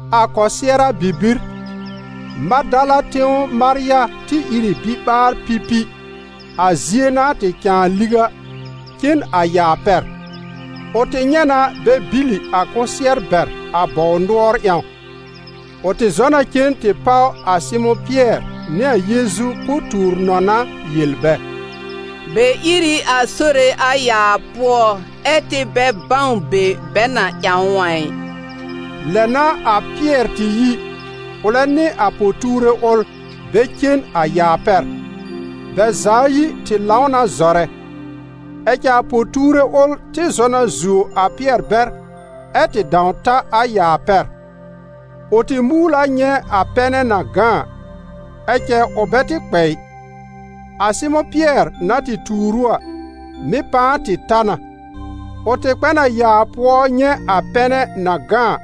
A kɔsɩɛra bibir, Madala tẽw Marya tɩ ìr ɩ biɓaar-pipi, a zie na tɩ cãa liw a, cen a yaa pɛr. Ʋ tɩ nyɛ̃ na bɛ bìlì a kʋsɩɛr bɛr a bɔw nʋɔr ƴãw. Ʋ tɩ zɔ na cen tɩ páw a Sɩmʋ̃ Pɩɛr nɩ a Yeezu po-tuur-nɔna yel bɛ: «Bɛ ír ɩ a Sore a yaa pʋɔ ɛ́ tɩ bɛ bãw be bɛ na ƴãw ʋ a ɩ.» Lɛ n'a a Pɩɛr tɩ yi, ʋlɛ nɩ a po-tuure ʋl, bɛ cen a yaa pɛr. Bɛ za ayi tɩ lãw na zɔrɛ; ɛ cɛ a po-tuure ʋl tɩ zɔ na zuo a Pɩɛr bɛr ɛ tɩ dãw ta a yaa pɛr. Ʋ tɩ muul a nyɛ̃ a pɛnɛ na gã a, ɛ cɛ ʋ bɛ tɩ kpɛ ɩ. A Sɩmʋ̃ Pɩɛr na tɩ tuur ʋ a, mɩ̀ pãa tɩ ta na. Ʋ tɩ kpɛ n a yaa pʋɔ nyɛ̃ a pɛnɛ na gã a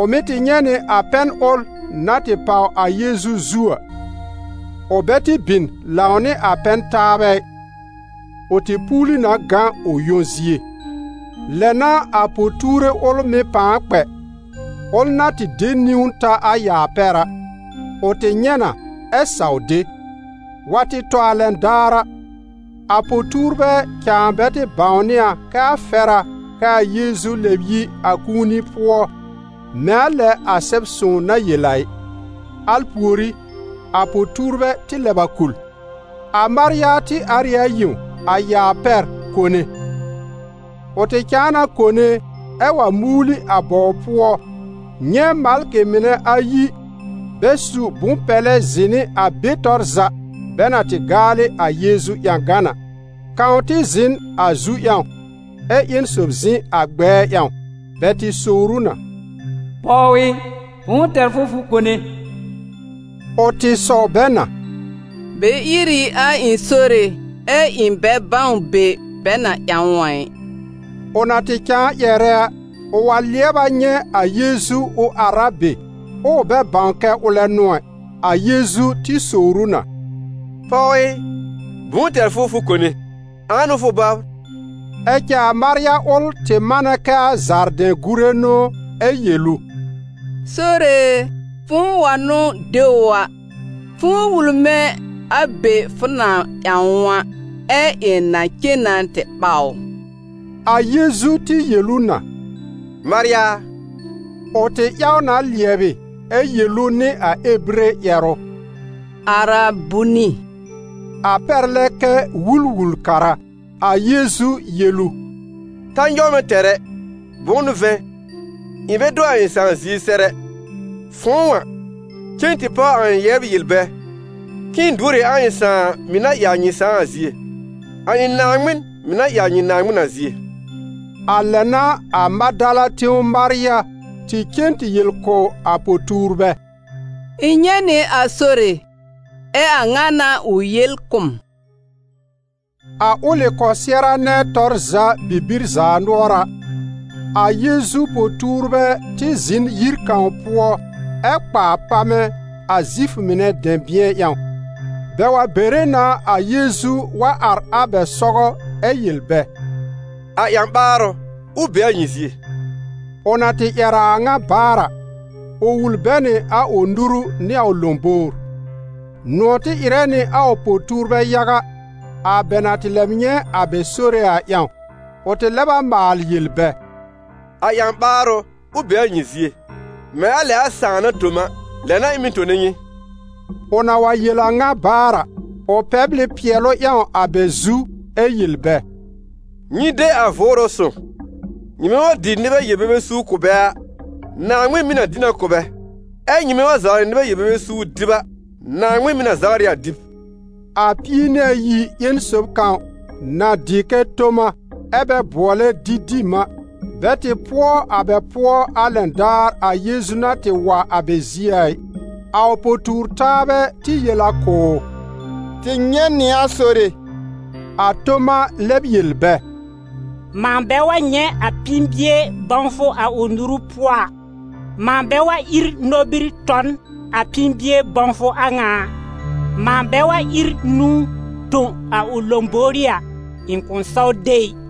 ʋ mɩ̀ tɩ nyɛ̃ nɩ a pɛn ʋl na tɩ páw a Yeezu zu a; ʋ bɛ tɩ bin lãw nɩ a pɛn-taabɛ ɩ, ʋ tɩ puuli na gã ʋ yõ zie. Lɛ n'a a po-tuure ʋl mɩ̀ pãa kpɛ, ʋl na tɩ de niwn ta a yaa pɛr a. Ʋ tɩ nyɛ̃ na ɛ saw de. Wa tɩ tɔ a lɛn daar a, a po-tuurbɛ cãa bɛ tɩ bãwnɩ a kɛ a fɛr a kɛ a Yeezu lɛb yi a kũuni pʋɔ, mɛ̃ a lɛ a Sɛb-sõw na yel a ɩ. Al pùorí, a po-tuurbɛ tɩ lɛb a kul. A Marya tɩ ar ɩ a yẽw, a yaa pɛr, kone. Ʋ tɩ cãa na kone ɛ wa muul ɩ a bɔw pʋɔ nyɛ̃ malkɩ mɩnɛ ayi bɛ su bʋ̃-pɛlɛ zɩ̃ nɩ a be tɔr za bɛ na tɩ gaalɩ a Yeezu ƴãgan a, kãw tɩ zɩ̃ n a zu ƴãw, ɛ ƴẽn sob zɩ̃ a gbɛɛ ƴãw. Bɛ tɩ sowr ʋ na: «Pɔw ɩ, bʋ̃ʋ tɛr fʋ fʋ kone?» Ʋ tɩ sɔw bɛ na: «Bɛ ír ɩ a ɩ̃ Sore, ɛ ɩ̃ bɛ bãw be bɛ na ƴãw ʋ a ɩ.» Ʋ na tɩ cãa ƴɛrɛ a, ʋ wa lɩɛb a nyɛ̃ a Yeezu ʋ ar a be, ɛ ʋ bɛ bãw kɛ ʋlɛ n'ʋ ɛ. A Yeezu tɩ sowr ʋ na: «Pɔw ɩ, bʋ̃ʋ tɛr fʋ fʋ kone? Ãa n'ʋ fʋ bɔbr?» Ɛ cɛ a Marya ʋl tɩ manɛ kɛ a zaardɛ̃-gùre n'ʋ ɛ yel ʋ: «Sore e, fʋ̃ʋ wa n'ʋ de ʋ a, fʋ̃ʋ wul mɛ̃ a be fʋ na ƴãw ʋ a, ɛ ɩ̃ na cen na tɩ ɓaw ʋ!» A Yeezu tɩ yel ʋ na: «Marya!» Ʋ tɩ ƴaw na lɩɛbɩ ɛ yel ʋ nɩ a Ebire ƴɛrʋ: «Arabuni!» A pɛr lɛ kɛ: «Wul-wul-kara.» A Yeezu yel ʋ: «Ta nyɔw mɛ̃ tɛr ɛ! Bʋ̃ʋ n'ʋ vɛ̃, ɩ̃ bɛ do a ɩ̃ Sãà zie sɛr ɛ. Fʋ̃ʋ a, cen tɩ páw a ɩ̃ yɛbr yel bɛ k'ɩ̃ɩ duor ɩ a ɩ̃ Sãà mɩ̀ na ɩ a nyɩ Sãà a zie, a ɩ̃ Naaŋmɩn, mɩ̀ na ɩ a nyɩ Naaŋmɩn a zie.» A lɛ n'a a Madala tẽw Marya tɩ cen tɩ yel kʋ̀ a po-tuurbɛ: «Ɩ̃ nyɛ̃ nɩ a Sore. Ɛ a ŋa n'a ʋ yel kʋ̀ m.» A ʋlɩ kɔsɩɛra nɛ tɔr za bibir zaanʋɔra, a Yeezu po-tuurbɛ tɩ zɩ̃ n yir kãw pʋɔ ɛ kpa a pamɛ̃, a Zifʋ mɩnɛ dɛ̃bɩ̃ɛ ƴãw. Bɛ wa bere na a Yeezu wa ar a bɛ sɔgɔ ɛ yel bɛ: «A ƴã-ɓaarʋ, ʋ be a nyɩ zie!» Ʋ na tɩ ƴɛr a a ŋa baar a, ʋ wul bɛ nɩ a ʋ nuru nɩ a ʋ lõbowr. Nʋ̃ɔ̀ tɩ ɩrɛ nɩ a ʋ po-tuurbɛ yaga, a bɛ na tɩ lɛb nyɛ̃ a bɛ Sore a ƴãw. Ʋ tɩ lɛb a maal yel bɛ: «A ƴã-ɓaarʋ, ʋ be a nyɩ zie! Mɛ̃ a lɛ a Sãà na tõ m a, lɛ n'a ɩ̃ mɩ̀ tone nyɩ.» Ʋ na wa yel a ŋa baar a, ʋ pɛbl ɩ pɩɛlʋ ƴãw a bɛ zu ɛ yel bɛ: «Nyɩ de a Vʋʋrʋ Sõw! Nyɩmɛ wa dɩ nɩbɛ yel-bebe suur kʋ̀ bɛ a, Naaŋmɩn mɩ̀ na dɩ na kʋ̀ bɛ, ɛ́ nyɩmɛ wa zawrɩ nɩbɛ yel-bebe suur dɩb a, Naaŋmɩn mɩ̀ na zawr ɩ a dɩb.» A Pie-nɩ-ayi ƴẽn sob kãw, na dɩ kɛ Toma, ɛ bɛ bʋɔlɛ Didim a, bɛ tɩ pʋɔ a bɛ pʋɔ a lɛn daar a Yeezu na tɩ wa a bɛ zie a ɩ. A ʋ po-tuur-taabɛ tɩ yel a kʋ̀ ʋ: «Tɩ nyɛ̃ nɩ a Sore!» A Toma lɛb yel bɛ: «Mãa bɛ wa nyɛ̃ a pĩi-bie bãwfʋ a ʋ nuru pʋɔ a, mãa bɛ wa ír nobir tɔ n a pĩi-bie bãwfʋ a ŋa a, mãa bɛ wa ír nũu tõ a ʋ lõbówrí a, ɩ̃ kʋ̃ saw de ɩ.»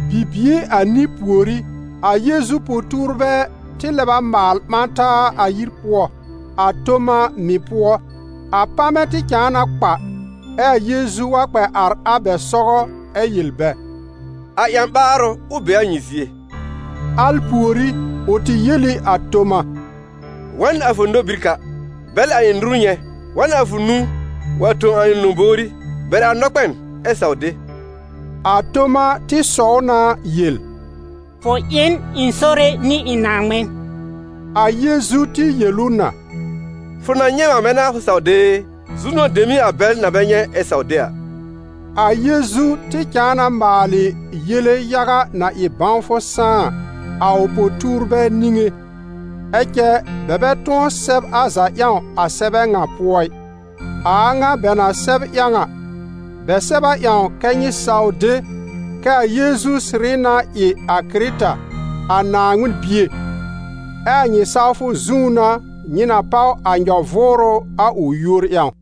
Bibie anĩ pùorí, a Yeezu po-tuurbɛ tɩ lɛb a maal ɓã taa a yir pʋɔ, a Toma mɩ̀ pʋɔ. A pamɛ̃ tɩ cãa na kpa, ɛ a Yeezu wa kpɛ ar a bɛ sɔgɔ ɛ yel bɛ: «A ƴã-ɓaarʋ, ʋ be a nyɩ zie!» Al pùorí, ʋ tɩ yel ɩ a Toma: «Wa n a fʋ nobir ka, bɛl a ɩ̃ nuru nyɛ̃, wa n a fʋ nũu wa tõ a ɩ̃ lõbówrí, bɛr a nɔkpɛn ɛ saw de.» A Toma tɩ sɔw na yel: «Fʋ ɩ n ɩ̃ Sore nɩ ɩ̃ Naaŋmɩn!» A Yeezu tɩ yel ʋ na: «Fʋ na nyɛ̃ m a bɛ n'a fʋ saw de e? Zu-nʋ̃ɔ̀ dem n'ɩ a bɛl na bɛ nyɛ̃ ɛ saw de a!» A Yeezu tɩ cãa na maalɩ yele yaga na ɩ bãwfʋ sãá a, a ʋ po-tuurbɛ niŋé, ɛ cɛ bɛ bɛ tʋ̃ɔ sɛb a za ƴãw a sɛbɛ ŋa pʋɔ ɩ. A a ŋa bɛ na sɛb ƴãw a, bɛ sɛb a ƴãw kɛ́ nyɩ saw de kɛ a Yeezu sɩrɩ na ɩ a Kɩrɩta, a Naaŋmɩn Bie, ɛ a nyɩ sawfʋ zũú n'a nyɩ na páw a nyɔ-vʋʋrʋ a ʋ yúor ƴãw.